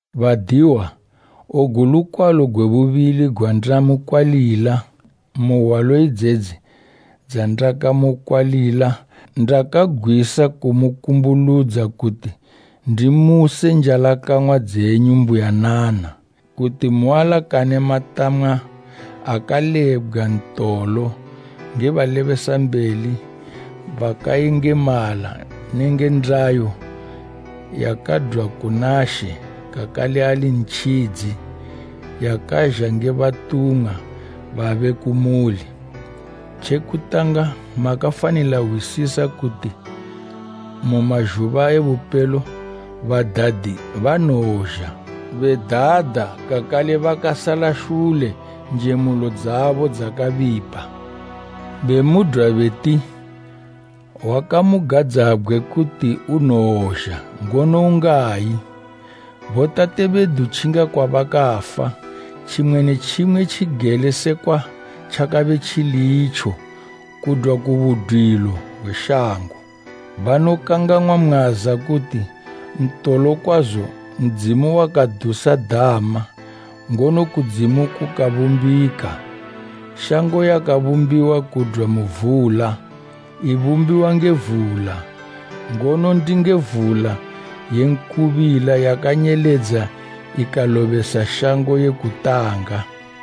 Badiwa, ogu lukwalo gwe bubili gwanda mu kwalila, mu hwalo idzedzi dzandakamukwalila ndakagwisa kumukumbuludza kuti ndimuse njalakang'wa dzenyu mbuyanana. Kuti mualakane matama akalebgwa ntolo nge balebesambeli bakayengemala nenge ndayo yakadwa kuna She kakale ali Ntjidzi, yakazha nge batumwa babe kumuli. Tje kutanga makafanila hwisisa kuti mu mazhuba e bupelo badadi banowozha bedada kakale bakasala shule njemulo dzabo dzakabipa, bemudwa beti, “Wakamugadzabgwe kuti unowozha, ngono ungayi? Botate bedu tjinga kwabakafa, tjimwe ne tjimwe tjigele sekwa tjakabe tjili itjo kudwa ku budwilo gwe shango.” Banokangang'wa mwaza kuti, ntolo kwazo Ndzimu wakadusa dama, ngono kudzimu kukabumbika. Shango yakabumbiwa kudwa mu vula, ibumbiwa nge vula, ngono ndinge vula ye nkubila yakanyeledza ikalobesa shango ye kutanga.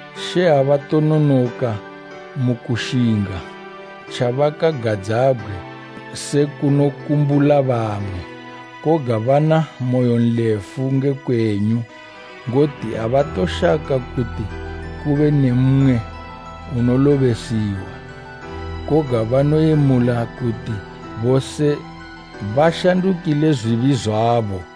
She abatononoka mu kushinga tjabakagadzabgwe se kunokumbula bamwe. Koga bana moyonlefu nge kwenyu, ngoti abatoshaka kuti kube ne mmwe unolobesiwa, koga banoyemula kuti bose bashanduke mu matjinyo abo.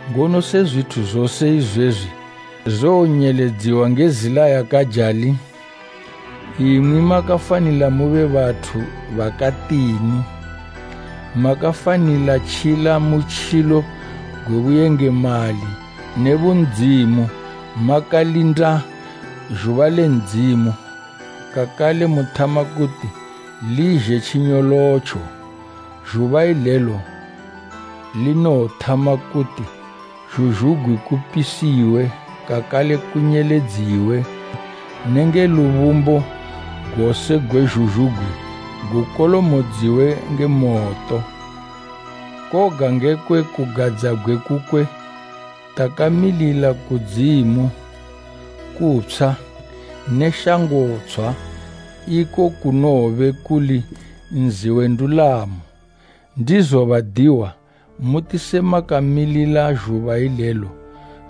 Ngono se zwithu zose izwezwi zowonyeledziwa nge zila yakajali, imwi makafanila mube bathu bakatini? Makafanila tjila butjilo gwe buyengemali ne bundzimu, makalindila zhuba le Ndzimu kakale muthama kuti lizhe tjinyolotjo. Zhuba ilelo linowothama kuti zhuzhugwi kupisiwe kakale kunyeledziwe nenge lubumbo gose gwe zhuzhugwi gukolomodziwe nge moto. Koga ngekwe kugadzabgwe kukwe takamilila kudzimu kutshwa ne shango tshwa, iko kunowobe kuli nzi we ndulamo. Ndizo badiwa, muti se makamilila zhuba ilelo,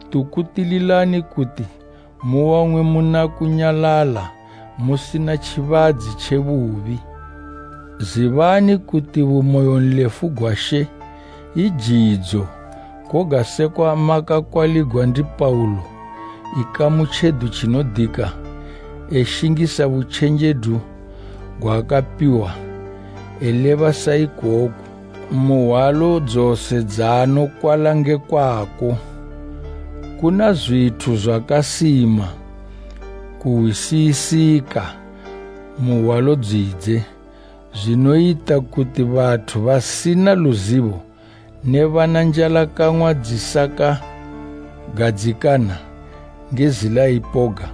tukutililani kuti muwang'we muna kunyalala musina tjibadzi tje bubi. Zibani kuti bumoyonlefu gwa She i jidzo koga sekwa makakwaligwa ndi Paulo, ikamu tjedu tjinodika, eshingisa butjenjedu gwaakapiwa, eleba sa ikoku mu hwalo dzose dzaanokwala ngekwako. Kuna zwithu zwakasima kuhwisisika, mu hwalo dzidze zwinoyita kuti bathu basina luzibo ne bana njalakang'wa dzisakagadzikana bakazwitjenesa, nge zila ipoga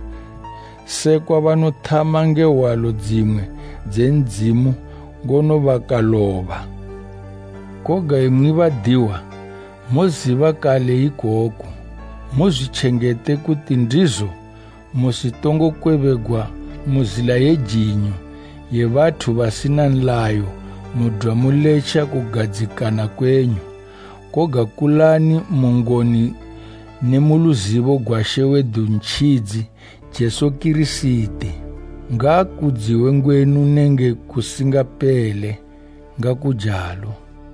sekwa banothama nge hwalo dzimwe dze Ndzimu ngono bakaloba. Koga imwi badiwa, moziba kale ikoku. Muzwitjengete kuti ndizo musitongokwebegwa mu zila ye jinyo, ye bathu basina nlayo mudwa muletja kugadzikana kwenyu. Koga kulani mu ngoni ne mu luzibo gwa She wedu Ntjidzi Jesu Kirisiti. Ngaakudziwe ngwenu nenge kusingapele! Ngakujalo.